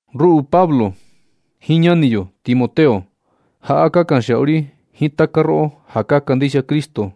Ruꞌu Pablo jiin ñani yo Timoteo, jaꞌa ka kanxiaꞌu ri jiin taka roꞌo ja ka kandixia Cristo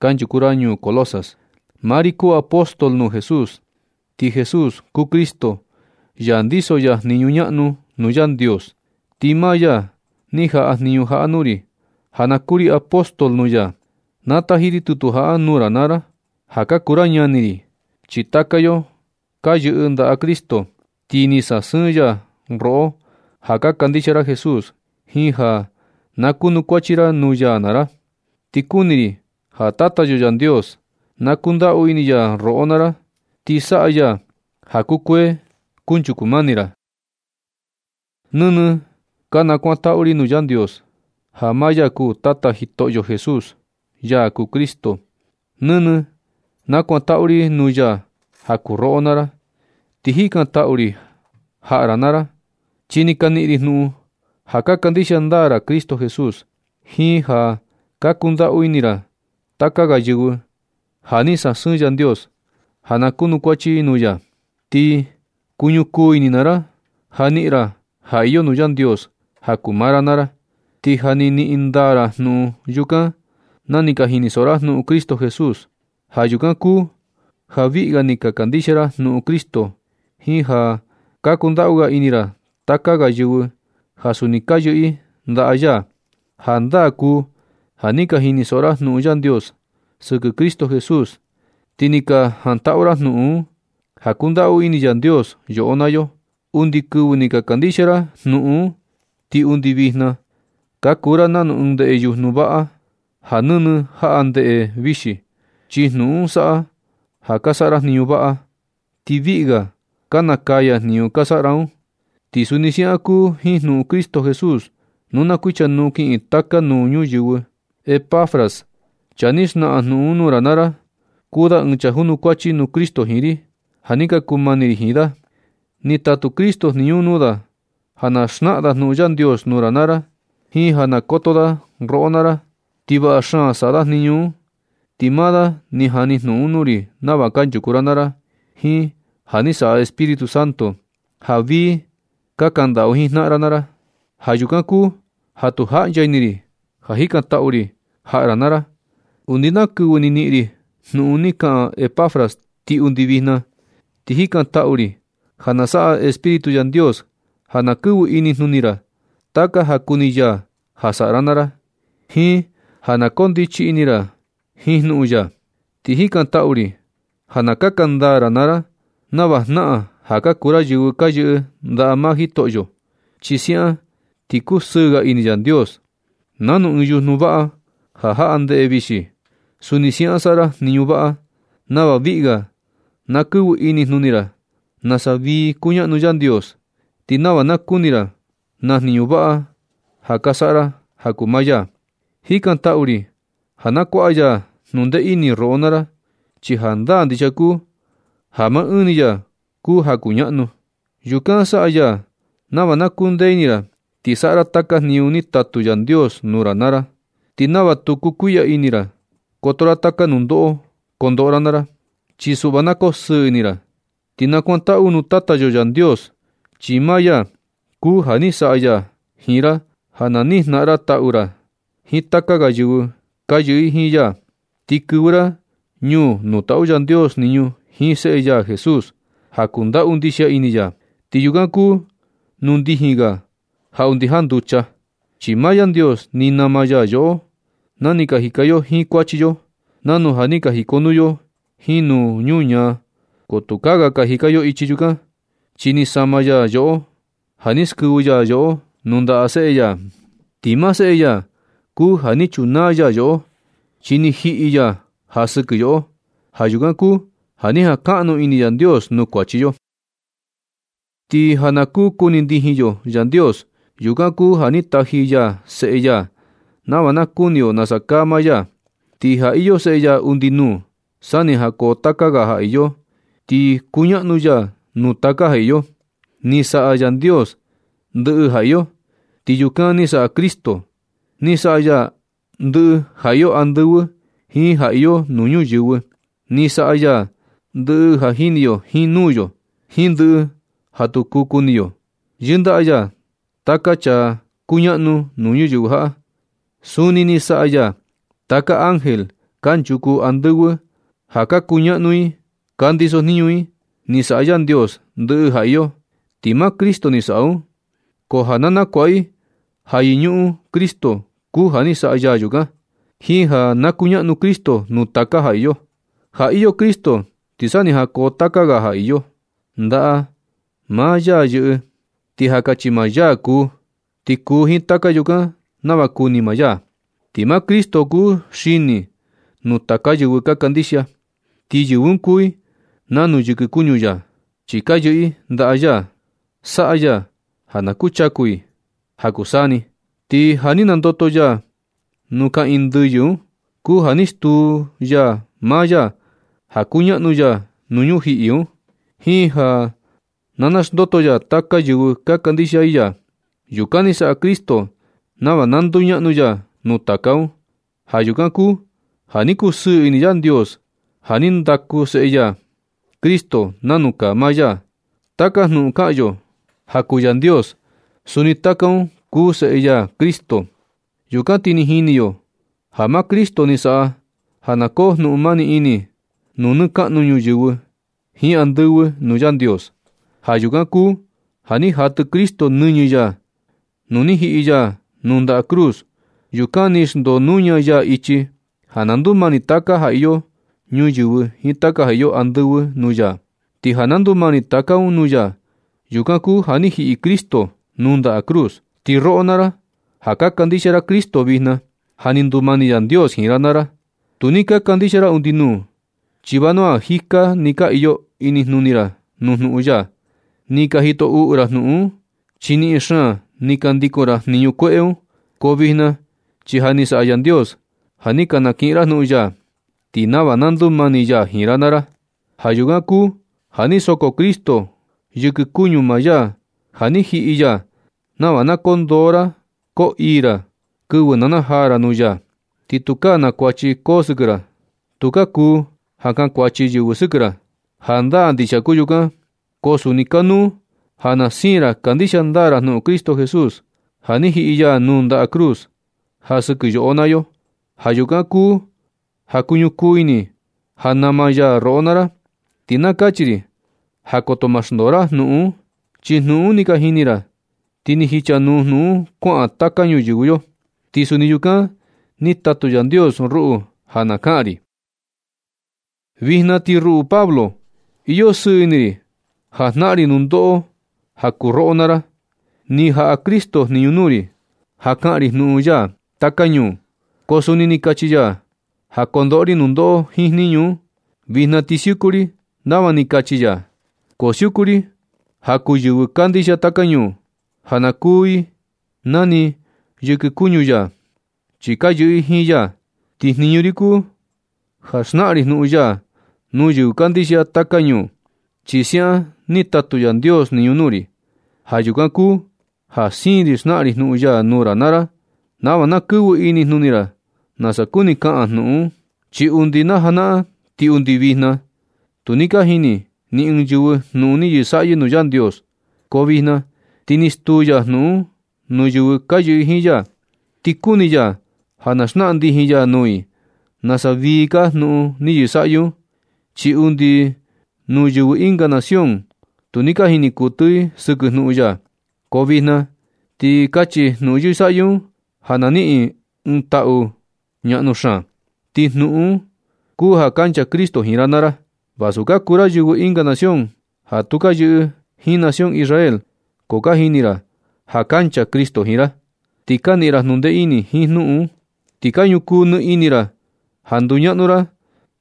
kanchuku ra ñuu Colosas. Maa ri kuu apóstol nuu Jesús, ti Jesús kuu Cristo, ya ndiso ya jniñu ñaꞌnu nuu Yandios. Ti maa ya ni jaꞌa jniñu jaꞌa nuu ri ja na kuu ri apóstol nuu ya. Na taji ri tutu jaꞌa nuu ra naa ra ja ka kuu ra ñani ri, chi taka yo ka yɨꞌɨ ndaꞌa Cristo. Ti ni sasɨɨn ya roꞌo ja ka kandixia ra Jesús, jiin ja na kunukuachi ra nuu ya naa ra. Ti kuni ri ja Tata yo Yandios, na kundaꞌu ini ya roꞌo naa ra, ti saꞌa ya ja kukuee kunchuku mani ra. Nɨnɨ ka nakuantaꞌu ri nuu Yandios, ja maa ya kuu Tata Jitoꞌo Jesús, ya kuu Cristo. Nɨnɨ nakuantaꞌu ri nuu ya ja kuu roꞌo naa ra, ti jikantaꞌu ri jaꞌa ra naa ra, chi ni ka niꞌin ri jnuꞌun ja ka kandixia ndaa ra Cristo Jesús, jiin ja ka kundaꞌu ini ra taka ga yɨvɨ ja ni sasɨɨn Yandios ja na kunukuachi i nuu ya. Ti kuñukuu ini maa ra ja na niꞌin ra ja iyo nuu Yandios ja kuu maa ra naa ra. Ti ja ni niꞌin ndaa ra jnuꞌun yukan na ni ka jinisoꞌo ra jnuꞌun Cristo Jesús. Ja yukan kuu ja viꞌi ga ni ka kandixia ra jnuꞌun Cristo jiin ja ka kundaꞌu ga ini ra taka ga yɨvɨ ja suni ka yɨꞌɨ i ndaꞌa ya. Jandaa kuu ja ni ka jinisoꞌo ra jnuꞌun Yandios sɨkɨ Cristo Jesús, ti ni ka jantaꞌu ra jnuꞌun un ja kundaꞌu ini Yandios yoꞌo naa yo. Undi kɨvɨ ni ka kandixia ra jnuꞌun un, ti undi vijna ka kuu ra nanu ɨɨn ndeꞌe yujnu vaꞌa, ja nɨnɨ jaꞌa ndeꞌe vixi, chi jnuꞌun un saꞌa ja ka saꞌa ra jniñu vaꞌa, ti viꞌi ga ka nakaya jniñu ka saꞌa ra un. Ti suni siaꞌan kuu jiin jnuꞌun Cristo Jesús nu na kuichanuu kiꞌin taka nuu ñuyɨvɨ. Epafras, chaa ni xnaꞌan jnuꞌun un nuu ra naa ra, kuu da ɨɨn chaa junukuachi nuu Cristo jiin ri, ja ni ka kuu mani ri jiin da. Ni tatu Cristo jniñu un nuu da ja na xnaꞌan da jnuꞌun Yandios nuu ra naa ra jiin ja na koto da roꞌo naa ra. Ti vaꞌa xaan saꞌa da jniñu un. Ti maa da ni jani jnuꞌun un nuu ri nava kanchuku ra naa ra jiin ja ni saꞌa Espíritu Santo, ja vii ka kandaꞌu jiin jnaꞌan ra naa ra. Ja yukan kuu ja tu jaꞌncha ini ri ja jikantaꞌu ri jaꞌa ra naa ra, undi na kɨvɨ ni niꞌin ri jnuꞌun ni kaꞌan Epafras ti undi vijna. Ti jikantaꞌu ri ja na saꞌa Espíritu Yandios ja na kɨvɨ inijnuni ra taka ja kuni ya ja saꞌa ra naa ra, jiin ja na koo ndichi ini ra jiin jnuꞌun ya. Ti jikantaꞌu ri ja na kaka ndaa ra naa ra nava jnaꞌan ja ka kuu ra yɨvɨ ka yɨꞌɨ ndaꞌa maa Jitoꞌo, chi siaꞌan ti kusɨɨ ga ini Yandios. Nanu ɨɨn yujnu vaꞌa ja jaꞌa ndeꞌe vixi, suni siaꞌan saꞌa ra jniñu vaꞌa nava viꞌi ga na kɨvɨ inijnuni ra nasa vii kuñaꞌnu Yandios, ti nava na kuni ra na jniñu vaꞌa ja ka saꞌa ra ja kuu maa ya. Jikantaꞌu ri ja na kuaꞌa ya jnundee ini roꞌo naa ra, chi jandaa ndixia kuu ja maa ɨɨn ni ya kuu ja kuñaꞌnu. Yukan saꞌa ya nava na kundee ini ra ti saꞌa ra taka jniñu ni tatu Yandios nuu ra naa ra, ti nava tu kuɨtɨ ini ra koto ra taka nundoꞌo kondoꞌo ra naa ra. Chi suꞌva na kosɨɨ ini ra, ti nakuantaꞌu nuu Tata yo Yandios, chi maa ya kuu ja ni saꞌa ya jiin ra ja na niꞌin jnaꞌan ra taꞌu ra jiin taka ga yɨvɨ ka yɨꞌɨ i jiin ya, ti kɨvɨ ra ñuu nuu taꞌu Yandios jniñu jiin seꞌe ya Jesús, ja kundaꞌu ndixia ini ya. Ti yukan kuu nuu ndijin ga ja undi janducha, chi maa Yandios ni nama ya yoꞌo na ni ka jika yo jiin kuachi yo, nanu ja ni ka jikonuu yo jiin nuu ñuñaa. Ko tukaa ga ka jika yo ichi yukan, chi ni sama ya yoꞌo ja ni skɨvɨ ya yoꞌo nuu ndaꞌa Seꞌe ya. Ti maa Seꞌe ya kuu ja ni chunaa ya yoꞌo, chi ni jiꞌi ya ja sɨkɨ yoꞌo. Ja yukan kuu ja ni jankaꞌnu ini Yandios nuu kuachi yo. Ti ja na kuu kuni ndijin yo Yandios, yukan kuu ja ni taji ya Seꞌe ya nava na kuni yo nasa kaa maa ya. Ti ja iyo Seꞌe ya undi nuu, sa ni jankoo taka ga ja iyo, ti kuñaꞌnu ya nuu taka ja iyo. Ni saꞌa Yandios ndɨꞌɨ ja iyo, ti yukan ni saꞌa Cristo. Ni saꞌa ya ndɨꞌɨ ja iyo andɨvɨ jiin ja iyo nuu ñuyɨvɨ. Ni saꞌa ya ndɨꞌɨ ja jini yo jiin nuu yo, jiin ndɨꞌɨ ja tu kuu kuni yo. Yɨndaꞌa ya taka chaa kuñaꞌnu nuu ñuyɨvɨ jaꞌa. Suni ni saꞌa ya taka ángel kanchuku andɨvɨ ja ka kuñaꞌnu i ka ndisojniñu i. Ni saꞌa Yandios ndɨꞌɨ ja iyo, ti maa Cristo ni saꞌa un, ko ja na nakuaꞌa i ja yɨñuꞌun Cristo kuu ja ni saꞌa ya yukan, jiin ja na kuñaꞌnu Cristo nuu taka ja iyo. Ja iyo Cristo ti sa ni jankoo taka ga ja iyo. Ndaꞌa maa ya yɨꞌɨ, ti ja kachi maa ya kuu, ti kuu jiin taka yukan nava kuni maa ya. Ti maa Cristo kuu xini nuu taka yɨvɨ ka kandixia, ti yɨvɨ un kuu i nanu yɨkɨ kuñu ya, chi ka yɨꞌɨ i ndaꞌa ya. Saꞌa ya ja na kuchaku i ja kuu taka ni saa ni. Ti ja ni nandoto ya nuu kaꞌiin ndɨyɨ un kuu ja ni stuu ya maa ya ja kuñaꞌnu ya nuu ñujiꞌi un, jiin ja na naxndoto ya taka yɨvɨ ka kandixia i ya. Yukan ni saꞌa Cristo nava na nduñaꞌnu ya nuu taka un. Ja yukan kuu ja ni kusɨɨ ini Yandios ja ni ndaku seꞌe ya Cristo nanu kaa maa ya. Taka jnuꞌun kaꞌan yo ja kuu Yandios, suni taka un kuu Seꞌe ya Cristo. Yukan ti ni jini yo ja maa Cristo ni saꞌa ja na koo jnuꞌun mani ini nuu nɨ kaꞌnu ñuyɨvɨ jiin andɨvɨ nuu Yandios. Ja yukan kuu ja ni jatɨ Cristo nɨñɨ ya nu ni jiꞌi ya nuu ndaꞌa cruz. Yukan ni xndoo nuña ya ichi ja na ndumani taka ja iyo ñuyɨvɨ jiin taka ja iyo andɨvɨ nuu ya. Ti ja na ndumani taka un nuu ya, yukan kuu ja ni jiꞌi Cristo nuu ndaꞌa cruz. Ti roꞌo naa ra ja ka kandixia ra Cristo vijna, ja ni ndumani Yandios jiin ra naa ra. Tu ni ka kandixia ra undi nuu, chi vanua jika ni ka iyo inijnuni ra nuu jnuꞌun ya. Ni ka jito uꞌu ra jnuꞌun un, chi niꞌin xaan ni ka ndikun ra jniñu kueꞌe un. Ko vijna chi ja ni saꞌa Yandios ja ni ka kiꞌin ra jnuꞌun ya, ti nava na ndumani ya jiin ra naa ra. Ja yukan kuu ja ni soko Cristo yɨkɨ kuñu maa ya ja ni jiꞌi ya, nava na koo ndoo ra koo ii ra kɨvɨ na najaa ra nuu ya, ti tukaa na kuachi koo sɨkɨ ra. Tukaa kuu ja kankuachi yɨvɨ sɨkɨ ra. Jandaa ndixia kuu yukan, ko suni kanuu ja na siin ra kandixia ndaa ra jnuꞌun Cristo Jesús, ja ni jiꞌi ya nuu ndaꞌa cruz ja sɨkɨ yoꞌo naa yo. Ja yukan kuu ja kuñukuu ini ja nama ya roꞌo naa ra. Ti na kachi ri ja koto ma xndoo ra jnuꞌun un. Chi jnuꞌun un ni ka jini ra, ti ni jichanuu jnuꞌun un kuaꞌan taka ñuyɨvɨ yo. Ti suni yukan ni tatu Yandios ruꞌu ja na kaꞌan ri. Vijna ti ruꞌu Pablo, iyo sɨɨ ini ri ja jnaꞌan ri nundoꞌo ja kuu roꞌo naa ra. Ni jaꞌa Cristo jniñu nuu ri ja kaꞌan ri jnuꞌun ya taka ñuu, ko suni ni kachi ya ja kondoꞌo ri nundoꞌo jiin jniñu un. Vijna ti siuku ri nava ni kachi ya, ko siuku ri ja kuu yɨvɨ kandixia taka ñuu, ja ka kuu i nani yɨkɨ kuñu ya, chi ka yɨꞌɨ i jiin ya. Ti jniñu ri kuu ja xnaꞌan ri jnuꞌun ya nuu yɨvɨ kandixia taka ñuu, chi siaꞌan ni tatu Yandios jniñu nuu ri. Ja yukan kuu ja siin ri xnaꞌan ri jnuꞌun ya nuu ra naa ra nava na kɨvɨ inijnuni ra nasa kuni kaꞌan jnuꞌun un. Chi undi na janaꞌan ti undi vijna, tu ni ka jini ni ɨɨn yɨvɨ jnuꞌun ni yɨsaꞌyɨ nuu Yandios. Ko vijna ti ni stuu ya jnuꞌun un nuu yɨvɨ ka yɨꞌɨ jiin ya. Ni kuni ya ja na xnaꞌan ndijin ya nuu i nasa vii kaa jnuꞌun ni yɨsaꞌyɨ un, chi undi nuu yɨvɨ ɨnga nación tu ni ka jini kuɨtɨ i sɨkɨ jnuꞌun ya. Ko vijna ti kachi jnuꞌun yɨsaꞌyɨ un ja na niꞌin i ɨɨn taꞌu ñaꞌnu xaan. Ti jnuꞌun un kuu ja kancha Cristo jiin ra naa ra, vasu ka kuu ra yɨvɨ ɨnga nación ja tu ka yɨꞌɨ jiin nación Israel. Ko ka jini ra ja kancha Cristo jiin ra, ti ka niꞌin ra jnundee ini jiin jnuꞌun un, ti ka ñukuu nɨ ini ra ja nduñaꞌnu ra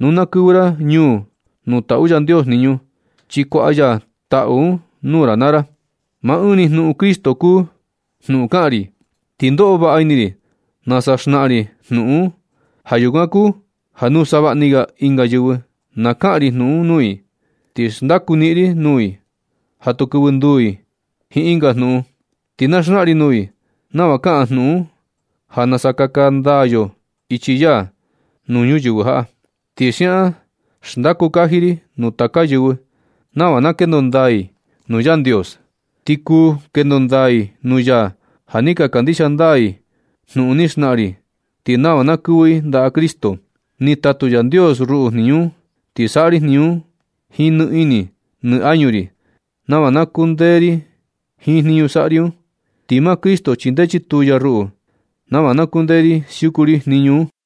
nu na kɨvɨ ra ñuu nuu taꞌu Yandios jniñu, chi kuaꞌa ya taꞌu un nuu ra naa ra. Maa ɨɨn ni jnuꞌun Cristo kuu jnuꞌun kaꞌan ri. Ti ndoꞌo vaꞌa ini ri nasa xnaꞌan ri jnuꞌun un. Ja yukan kuu ja nuu savaꞌni ga ɨnga yɨvɨ na kaꞌan ri jnuꞌun un nuu i, ti xndaku niꞌin ri nuu i ja tu kɨvɨ nduu i jiin ɨnga jnuꞌun. Ti na xnaꞌan ri nuu i nava kaꞌan jnuꞌun un ja nasa kaka ndaa yo ichi ya nuu ñuyɨvɨ jaꞌa. Ti siaꞌan xndaku kaji ri nuu taka yɨvɨ nava na kendo ndaa i nuu Yandios. Ti kuu kendo ndaa i nuu ya ja ni ka kandixia ndaa i jnuꞌun ni xnaꞌan ri, ti nava na kɨvɨ i ndaꞌa Cristo. Ni tatu Yandios ruꞌu jniñu un, ti saꞌa ri jniñu un jiin nɨ ini nɨ añu ri nava na kundee ri jiin jniñu saꞌa ri un. Ti maa Cristo chindee chituu ya ruꞌu nava na kundee ri siuku ri jniñu un.